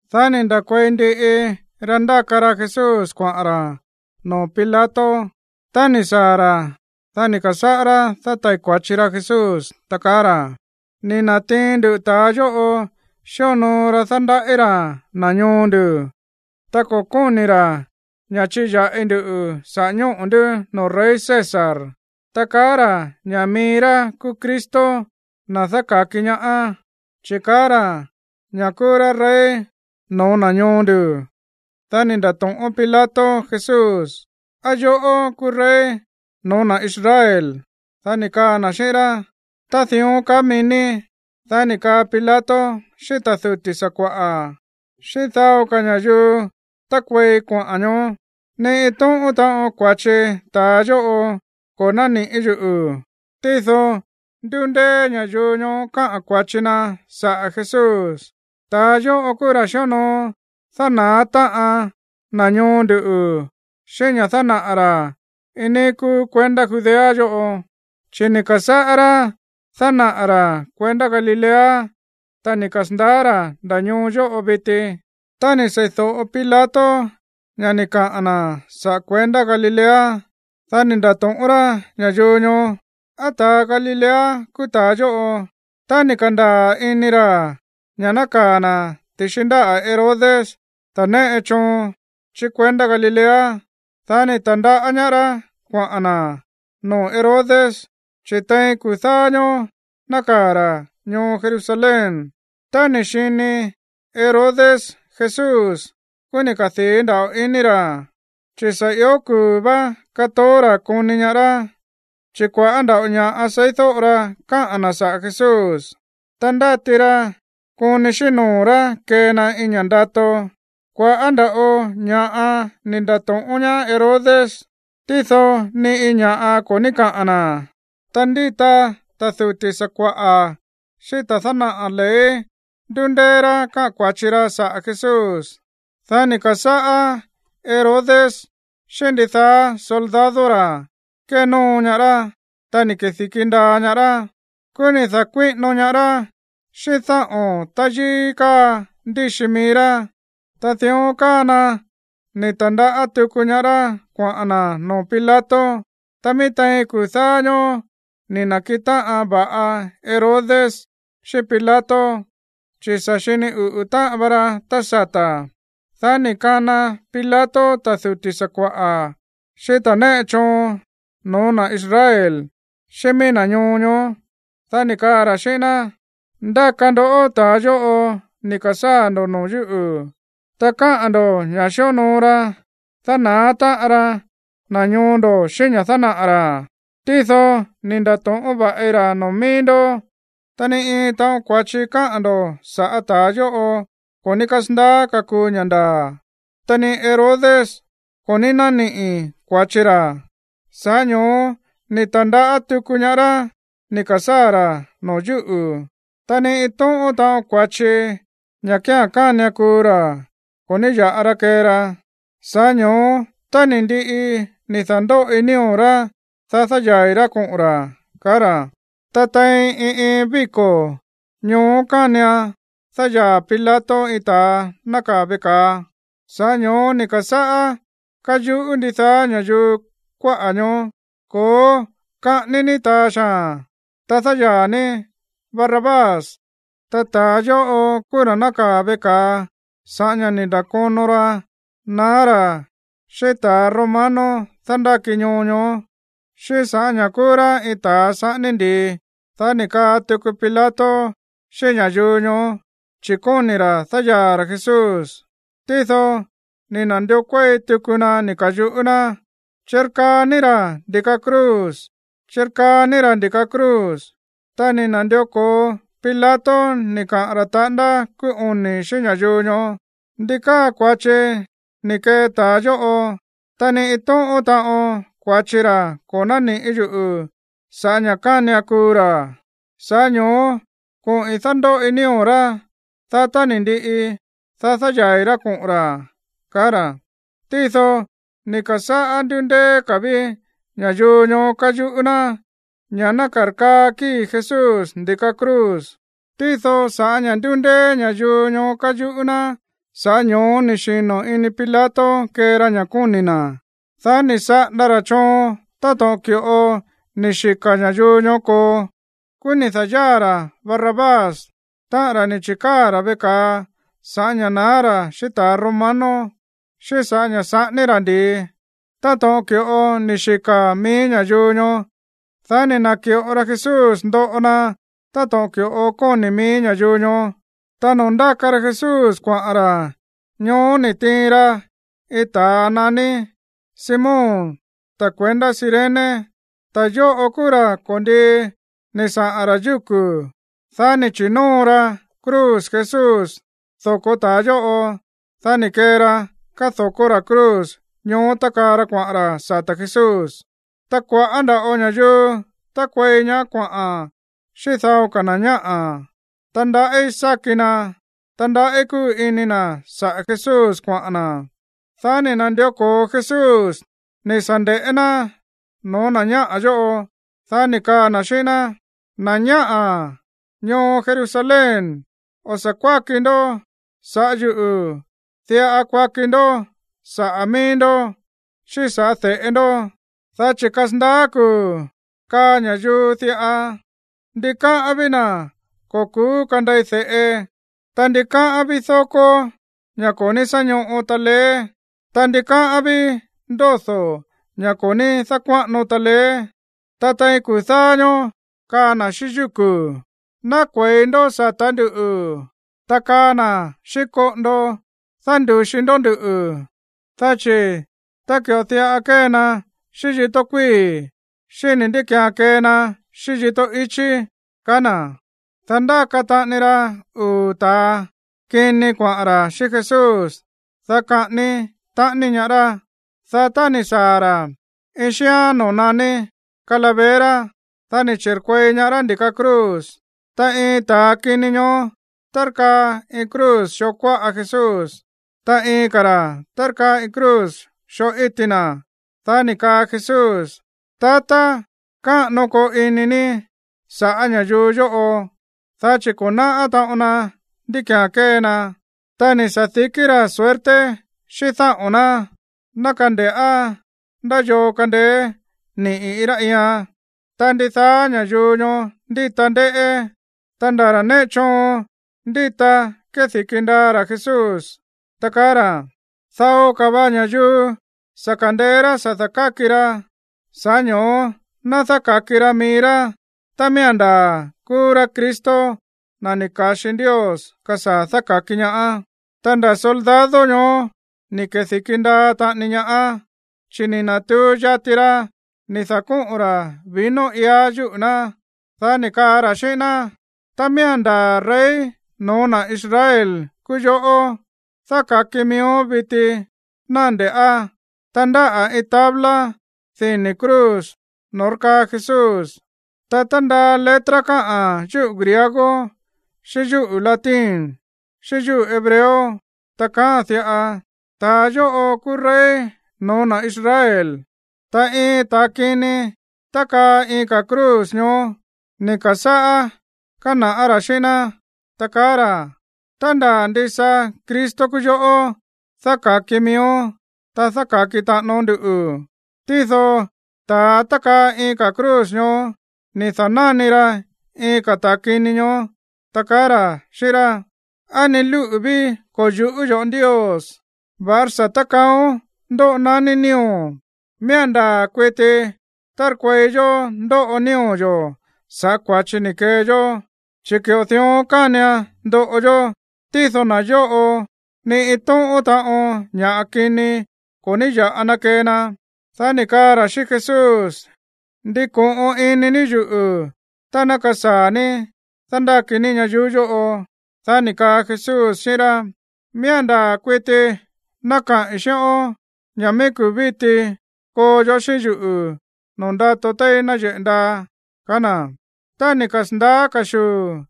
Dá ni̱ nda̱kuei ndiꞌi ra ndáka ra Jesús kuaꞌa̱n ra̱ noo̱ Pilato. Tá ni̱ saa̱ ra̱, dá ni̱ ka̱sáꞌá rá dátai̱ kua̱chi ra Jesús, ta kaá ra̱: ―Ni̱ na̱tiin nduꞌu̱ ta̱a yóꞌo xíonoo ra dándaꞌí ra̱ na̱ ñoo ndu̱. Ta ko̱ kóni̱ ra̱ ña̱ chíya̱ꞌi ndu saꞌa̱ ñóꞌo̱ ndú noo̱ rey César, ta kaá ra̱ ña̱ mií rá kúú Cristo, na̱ dáka̱ki ñaá, chi̱ kaá ra̱ ña̱ kúú rá rey no̱ó na̱ ñoo ndu̱. Dá ni̱ nda̱to̱ꞌón Pilato Jesús: ―¿Á yoꞌó kúú rey no̱ó na̱ Israel? Dá ni̱ kaa na̱ xíꞌín rá: ―Ta dión kaá mií ní. Dá ni̱ kaa Pilato xíꞌín ta̱ duti̱ sakua̱ꞌa̱, xíꞌín dao ka̱ ña̱yuu tákuei kuaꞌa̱n ñoó: ―Ni iin tóꞌón taꞌon kua̱chi ta̱a yóꞌo ko̱ nániꞌi̱ yuꞌu̱. Tído ndúndeé ña̱yuu ñoó káꞌa̱n kua̱chi na saꞌa̱ Jesús: ―Ta̱a yóꞌo kúú ra̱ xíonoo dána̱á táꞌan na̱ ñoo ndu̱ xíꞌín ña̱ dánaꞌa̱ ra̱ iin níí kúú kuendá Judea yóꞌo. Chi̱ ni̱ ka̱sáꞌá rá dánaꞌa̱ ra̱ kuendá Galilea, ta ni̱ kasa̱ndaá ra̱ nda̱ ñoo yóꞌo viti. Tá ni̱ sei̱do̱ꞌo Pilato ña̱ ni̱ kaꞌa̱n na̱ saꞌa̱ kuendá Galilea, dá ni̱ nda̱to̱ꞌón rá ña̱yuu ñoó: ―¿Á ta̱a Galilea kúú ta̱a yóꞌo? Tá ni̱ ka̱ndaa̱ ini ra̱ ña̱ nákaa̱ na̱ ti̱xi ndáꞌa̱ Herodes, ta̱ néꞌe choon chí kuendá Galilea, dá ni̱ ta̱ndaꞌá ñaá rá kuaꞌa̱n na̱ noo̱ Herodes, chi̱ tein kuu̱ dáá ñóó nákaa̱ ra̱ ñoo Jerusalén. Tá ni̱ xini Herodes Jesús, kúú ni̱ kadii̱ nda̱ꞌo ini ra̱, chi̱ sa̱ ió kuu̱ vá kátoó ra̱ koni ñaá rá. Chi̱ kua̱ꞌá ndava̱ꞌo ña̱ꞌa seídóꞌo ra káꞌa̱n na̱ saꞌa̱ Jesús, ta ndáti ra koni xíꞌín noo̱ rá kee na iin ña̱ꞌa ndato. Kua̱ꞌá nda̱ꞌo ña̱ꞌa ni̱ nda̱to̱ꞌón ñaá Herodes, tído ni iin ña̱ꞌa ko̱ ní káꞌa̱n na̱. Ta ndíta ta̱ duti̱ sakua̱ꞌa̱ xíꞌín ta̱ dánaꞌa̱ ley ndúndeé rá káꞌa̱n kua̱chi ra saꞌa̱ Jesús. Dá ni̱ ka̱sáꞌá Herodes xíꞌín ndidaá soldado ra̱ kénóo ñaá rá, ta ni̱ kedi̱ki ndaa ñaá rá. Kúú ni̱ da̱kuíꞌino ñaá rá xíꞌín dáꞌo̱n táyíí káa ndíxi mií rá. Ta dión káa na ni̱ ta̱ndaꞌá tuku ñaá rá kuaꞌa̱n na̱ noo̱ Pilato. Ta mií tein kuu̱ dáá ñóó ni̱ na̱kiꞌin táꞌan va̱ꞌa Herodes xíꞌín Pilato, chi̱ sa̱ xini uꞌu̱ táꞌan va ra tá sata̱. Dá ni̱ kana Pilato ta̱ duti̱ sakua̱ꞌa̱, xíꞌín ta̱ néꞌe choon no̱ó na̱ Israel, xíꞌín mií na̱ ñoo ñoó, dá ni̱ kaa ra̱ xíꞌín ná: ―Ndáka ndó ta̱a yóꞌo ni̱ ka̱sáa̱ ndo̱ noo̱ yúꞌu̱. Ta káꞌa̱n ndo̱ ña̱ xíonoo ra dána̱á táꞌan ra na̱ ñoo ndo̱ xíꞌín ña̱ dánaꞌa̱ ra̱. Tído ni̱ nda̱to̱ꞌón va̱ꞌi ra̱ noo̱ mií ndó, ta ni iin taꞌon kua̱chi káꞌa̱n ndo̱ sa̱ꞌá ta̱a yóꞌo ko̱ ní kasandaá kakuu ña̱ ndaa̱. Ta ni Herodes ko̱ ní nániꞌi̱ kua̱chi ra̱, sa̱ꞌá ño̱ó ni̱ ta̱ndaꞌá tuku ñaá rá ni̱ ka̱sáa̱ ra̱ noo̱ yúꞌu̱. Ta ni iin tóꞌón taꞌon kua̱chi, ña̱ kía̱n kánian kuu ra̱, ko̱ ní ya̱ꞌa ra kee ra. Sa̱ꞌá ño̱ó, tá ni̱ ndiꞌi ni̱ da̱ndóꞌi nío̱ rá, dá dáyaa̱i̱ rá koꞌo̱n ra̱ ―kaá ra̱. Ta tein iin iin víko̱ ñoó kánian dáyaa̱ Pilato iin ta̱a nákaa̱ veꞌe ka̱a. Sa̱ꞌá ño̱ó ni̱ ka̱sáꞌá káyuꞌú ndidaá ña̱yuu kuáꞌa̱ ñoó: ―¡Ko̱ó, kaꞌání ní ta̱a xaa̱n, ta dáyaa̱ ní Barrabás! Ta ta̱a yóꞌo kúú ra̱ nákaa̱ veꞌe ka̱a sa̱ꞌá ña̱ ni̱ nda̱kono ra naá ra̱ xíꞌín ta̱ romano dándáki ñoo ñoó, xíꞌín sa̱ꞌá ña̱ kúú rá iin ta̱a saꞌání ndi̱i. Dá ni̱ kaꞌa̱n tuku Pilato xíꞌín ña̱yuu ñoó, chi̱ kóni̱ ra̱ dáyaa̱ ra̱ Jesús. Tído ni̱ na̱ndió kuéi tuku na ni̱ ka̱yuꞌú ná: ―¡Chirkaa ní ra̱ ndi̱ka cruz, chirkaa ní ra̱ ndi̱ka cruz! Ta ni̱ na̱ndió ko̱o Pilato ni̱ kaꞌa̱n ra̱ taꞌándá kúú oni̱ xíꞌín ña̱yuu ñoó: ―¿Ndi káa kua̱chi ni̱ kee ta̱a yóꞌo? Ta ni iin tóꞌón taꞌon kua̱chi ra̱ ko̱ nániꞌi̱ yuꞌu̱ sa̱ꞌá ña̱ kánian kuu ra̱. Sa̱ꞌá ño̱ó koꞌi̱n dándóꞌi nío̱ rá, dá tá ni̱ ndiꞌi, dá dáyaa̱i̱ rá koꞌo̱n ra̱ ―kaá ra̱. Tído ni̱ ka̱sáꞌá ndúndeé ka̱ ví ña̱yuu ñoó káyuꞌú ná ña̱ ná karkaa kíi̱ Jesús ndi̱ka cruz. Tído sa̱ꞌá ña̱ ndúndeé ña̱yuu ñoó káyuꞌú ná, sa̱ꞌá ño̱ó ni̱ xino̱ ini Pilato kee ra ña̱ kóni̱ na̱. Dá ni̱ saꞌanda ra̱ choon táto̱ꞌon ki̱ꞌo ni̱ xika̱ ña̱yuu ñoó koo. Kúú ni̱ da̱yáa̱ ra̱ Barrabás, táꞌa̱n ra̱ ni̱ chi̱káa̱ ra̱ veꞌe ka̱a sa̱ꞌá ña̱ naá ra̱ xíꞌín ta̱ romano, xíꞌín sa̱ꞌá ña̱ saꞌání ra̱ ndi̱i, táto̱ꞌon ki̱ꞌo ni̱ xika̱ mií ña̱yuu ñoó. Dá ni̱ na̱ki̱ꞌo ra Jesús ndoꞌo na táto̱ꞌon ki̱ꞌo kóni̱ mií ña̱yuu ñoó. Ta noo̱ ndáka ra Jesús kuaꞌa̱n ra̱, ñoó ni̱ tiin ra iin ta̱a naní Simón, ta̱ kuendá Cirene. Ta̱ yóꞌo kúú ra̱ ko̱ndii ni̱ saꞌa̱n ra̱ yúku̱. Dá ni̱ chi̱nóo ra cruz Jesús doko̱ ta̱a yóꞌo, dá ni̱ kee ra kádo̱kó ra̱ cruz ñoó tákaa ra kuaꞌa̱n ra̱ sata̱ Jesús. Ta kua̱ꞌá nda̱ꞌo ña̱yuu tákuei ñaá kuaꞌa̱n xíꞌín dao ka̱ na̱ ñáꞌa̱, ta ndaꞌí sáki na, ta ndaꞌí kúu ini na̱ saꞌa̱ Jesús kuaꞌa̱n na̱. Dá ni̱ na̱ndió ko̱o Jesús ni̱ sa̱ nde̱ꞌé ná no̱ó na̱ ñáꞌa̱ yóꞌo. Dá ni̱ kaa na̱ xíꞌín ná: ―Na̱ ñáꞌa̱ ñoo Jerusalén, o̱ sa̱ kuáki ndó saꞌa̱ yúꞌu̱. Diꞌa kuaki ndó saꞌa̱ mií ndó xíꞌín sa̱ꞌá de̱ꞌe ndó, dá chi̱ kasandaá kuu̱ kaa ña̱yuu diꞌa: “Ndikáꞌán ví na̱ ko̱ ku̱ú kandei de̱ꞌe, ta ndikáꞌán ví dókó, ña̱ ko̱ ní sá ñóꞌo taleé, ta ndikáꞌán ví ndódo̱, ña̱ ko̱ ní dákuáꞌano taleé.” Ta tein kuu̱ dáá ñóó kaa na̱ xíꞌín yúku̱: “Ná kue̱i ndó sa̱tá nduꞌu̱.” Ta kaa na̱ xíꞌín koꞌondo: “Dándu̱xi ndó nduꞌu̱.” Dá chi̱ tá ki̱ꞌo diꞌa kée na xíꞌín yíto̱ kuíi̱, xíni̱ ndí ki̱án kee na xíꞌín yíto̱ ichí ―kaá na̱. Ta ndáka taꞌani ra uu̱ ta̱a kini kuaꞌa̱n ra̱ xíꞌín Jesús, dá kaꞌání taꞌani ñaá rá. Dá tá ni̱ saa̱ ra̱ iin xíán noo̱ naní Calavera, dá ni̱ chi̱rkuei ñaá rá ndi̱ka cruz. Ta iin ta̱a kini ñoó tárkaa iin cruz xoo kuáꞌa Jesús, ta iin ka̱ ra̱ tárkaa iin cruz xoo íti na̱. Dá ni̱ kaa Jesús: ―Tatá, káꞌano koo ini ní sa̱ꞌá ña̱yuu yóꞌo, dá chi̱ ko̱ náꞌá taꞌon na ndí ki̱án kée na. Ta ni̱ sa̱dikí ra̱ suerte xíꞌín dáꞌo̱n ná, ná kande̱ꞌá ndá yoo kandeé niꞌi̱ iin rá iian. Ta ndidaá ña̱yuu ñoó ndíta ndéꞌé, ta nda̱ ta̱ néꞌe choon ndíta kédi̱ki ndaa ra̱ Jesús, ta kaá ra̱: ―Dao ka̱ va ña̱yuu sa̱ ka̱ndeé rá sa̱ da̱káki ra, sa̱ꞌá ño̱ó ná dáka̱ki ra mií rá tá miía̱n ndaa̱ kúú rá Cristo, na̱ ni̱ ka̱xi Ndios kasaa̱ dáka̱ki ñaá. Ta nda̱ soldado ñoó ni̱ kedi̱ki ndaa taꞌani ñaá, chi̱ ni̱ na̱tuu yati ra ni̱ da̱kóꞌo̱n ra̱ vino iá yúꞌu̱ ná, dá ni̱ kaa ra̱ xíꞌín ná: ―Tá miía̱n ndaa̱ rey no̱ó na̱ Israel kúú yoꞌó, dáka̱ki miíón viti, ná nde̱ꞌá. Ta ndáꞌa̱ iin tabla dini̱ cruz noo̱ tárkaa Jesús, ta tándaa letra káꞌa̱n yúꞌu̱ griego xíꞌín yúꞌu̱ latín, xíꞌín yúꞌu̱ hebreo, ta kaáa̱n diꞌa: “Ta̱a yóꞌo kúú rey no̱ó na̱ Israel.” Ta iin ta̱a kini tákaa iin ka̱ cruz ñoó, ni̱ ka̱sáꞌá kána̱ꞌá ra̱ xíꞌín ná, ta kaá ra̱: ―Tá ndaa̱ ndisa Cristo kúú yoꞌó, dáka̱ki miíón, ta dáka̱ki taꞌánón nduꞌu̱. Tído ta̱a tákaa iin ka̱ cruz ñoó ni̱ da̱náni ra iin ka̱ ta̱a kini ñoó, ta kaá ra̱ xíꞌín rá: ―¿Á ni lúꞌu̱ ví ko̱ yu̱ꞌú yo̱ꞌó Ndios, va̱ꞌará sa̱ tákaaón ndóꞌo naní nío̱o̱n? Miía̱n ndaa̱ kuiti tárkuei yó ndóꞌo nío̱ yo̱ sa̱ꞌá kua̱chi ni̱ kee yó, chi̱ ki̱ꞌo dión kánian ndoꞌo yó. Tído na̱ yóꞌo, ni iin tóꞌón taꞌon ña̱ꞌa kini ko̱ ní ya̱ꞌa na kee na. Dá ni̱ kaa ra̱ xíꞌín Jesús: ―Ndiko̱ꞌon ini ní yuꞌu̱ tá ná kasaa̱ ní dándáki ní ñayuú yóꞌo. Dá ni̱ kaa Jesús xíꞌín rá: ―Miía̱n ndaa̱ kuiti ná kaꞌi̱n xíꞌón ña̱ mií kuu̱ víti koo yoꞌó xíꞌín yuꞌu̱ noo̱ ndato téí náyeꞌe̱ ndaa ―kaá na̱. Tá ni̱ kasa̱ndaá ka̱xuu̱,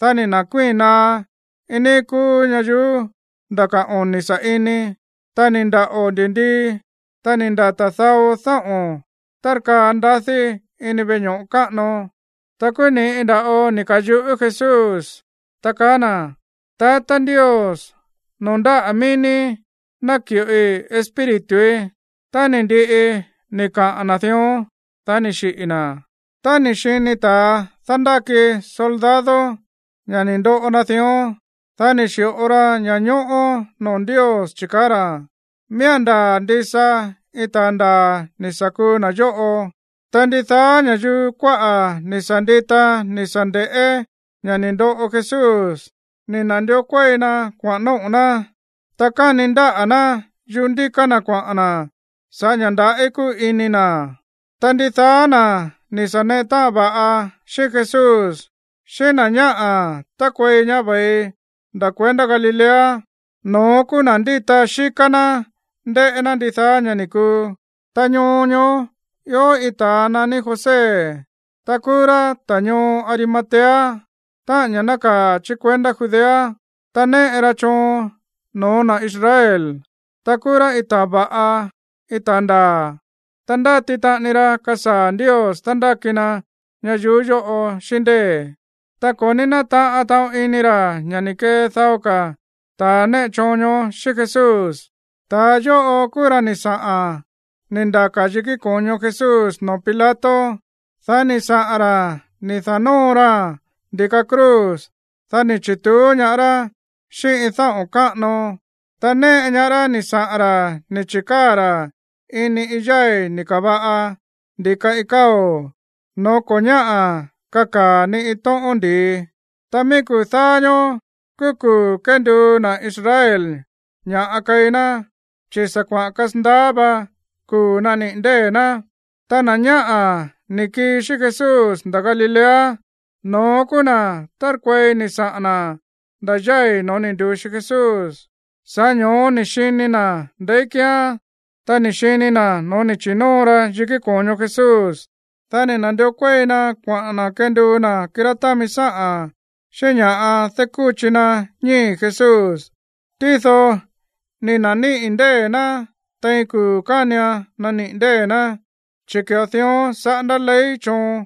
dá ni̱ na̱kuíi̱n naá iin níí kúú ñayuú nda̱ ka̱ oni̱ sa̱ꞌini. Ta ni̱ ndaꞌo̱ ndi̱ndii, ta ni̱ ndata̱ dao dáꞌo̱n tárkaa ndadí ini veꞌe ño̱ꞌo káꞌano. Ta kúú ni̱ꞌi nda̱ꞌo ni̱ ka̱yuꞌú Jesús, ta kaá na̱: ―Tatá Ndios, noo̱ ndáꞌa̱ mií ní náki̱ꞌoi espírituí. Tá ni̱ ndiꞌi ni̱ kaꞌa̱n na̱ dión, dá ni̱ xiꞌi̱ na̱. Tá ni̱ xini ta̱ dándáki soldado ña̱ ni̱ ndoꞌo na dión, dá ni̱ xi̱ꞌo ra ña̱ñóꞌó noo̱ Ndios, chi̱ kaá ra̱: ―Miía̱n ndaa̱ ndisa iin ta̱a ndaa̱ ni̱ sa̱ kuu na̱ yóꞌo. Ta ndidaá ña̱yuu kuáꞌa̱ ni̱ sa̱ ndita ni̱ sa̱ nde̱ꞌé ña̱ ni̱ ndoꞌo Jesús, ni̱ na̱ndió kuéi na kuaꞌa̱n nóꞌo̱ ná, ta kani ndáꞌa̱ ná yuꞌú ndíká ná kuaꞌa̱n na̱ sa̱ꞌá ña̱ ndaꞌí kúu ini na̱. Ta ndidaá na̱ ni̱ sa̱ neꞌe táꞌan va̱ꞌa xíꞌín Jesús, xíꞌín na̱ ñáꞌa̱ tákuei ñaá ve̱i nda̱ kuendá Galilea, no̱ón kúú na̱ ndíta xíká ná ndéꞌé ná ndidaá ña̱ ni̱ kuu. Ta ñoo ñoó ió iin ta̱a naní José, ta kúú rá ta̱ ñoo Arimatea, táꞌa̱n ña̱ nákaa̱ chí kuendá Judea. Ta néꞌe ra choon no̱ó na̱ Israel, ta kúú rá iin ta̱a va̱ꞌa, iin ta̱a ndaa̱. Ta ndáti taꞌani ra kasaa̱ Ndios dándáki na ñayuú yóꞌo xíꞌín ndée̱. Ta ko̱ ní nátaꞌan taꞌon ini ra̱ ña̱ ni̱ kee dao ka̱ ta̱ néꞌe choon ñoó xíꞌín Jesús. Ta̱a yóꞌo kúú ra̱ ni̱ saꞌa̱n ni̱ ndaka̱ yikí ko̱ño Jesús noo̱ Pilato. Dá ni̱ saꞌa̱n ra̱ ni̱ da̱nóo raa̱n ndi̱ka cruz. Dá ni̱ chi̱tuú ñaá rá xíꞌín iin dáꞌo̱n káꞌano. Ta néꞌe ñaá rá ni̱ saꞌa̱n ra̱ ni̱ chi̱káa̱ ra̱ ini iin yái̱ ni̱ ka̱va̱ꞌa ndi̱ka iin káo̱, noo̱ ko̱ ñáꞌa̱ kakaa̱ ni iin tóꞌón ndi̱i. Ta mií kuu̱ dáá ñóó kúú kuu̱ kénduu na̱ Israel ña̱ꞌa keí ná, chi̱ sa̱ kuaꞌa̱n kasandaá vá kuu̱ nániꞌi̱ ndée̱ ná. Ta na̱ ñáꞌa̱ ni̱ kii xíꞌín Jesús nda̱ Galilea, no̱ón kúú na̱ tárkuei ni̱ saꞌa̱n na̱ nda̱ yái̱ no̱ó ni̱ ndu̱xi Jesús, sa̱ꞌá ño̱ó ni̱ xini na̱ ndeí kíán, ta ni̱ xini na̱ no̱ó ni̱ chi̱nóo ra yikí ko̱ño Jesús. Dá ni̱ na̱ndió kuéi na kuaꞌa̱n na̱ kenduu na̱ kirá támi sáꞌa̱n xíꞌín ña̱ꞌa dákúchi na ñíi̱ Jesús. Tído ni̱ na̱níꞌi̱ ndée̱ ná tein kuu̱ kánian naniꞌi̱ ndée̱ ná, chi̱ ki̱ꞌo dión saꞌándá ley choon.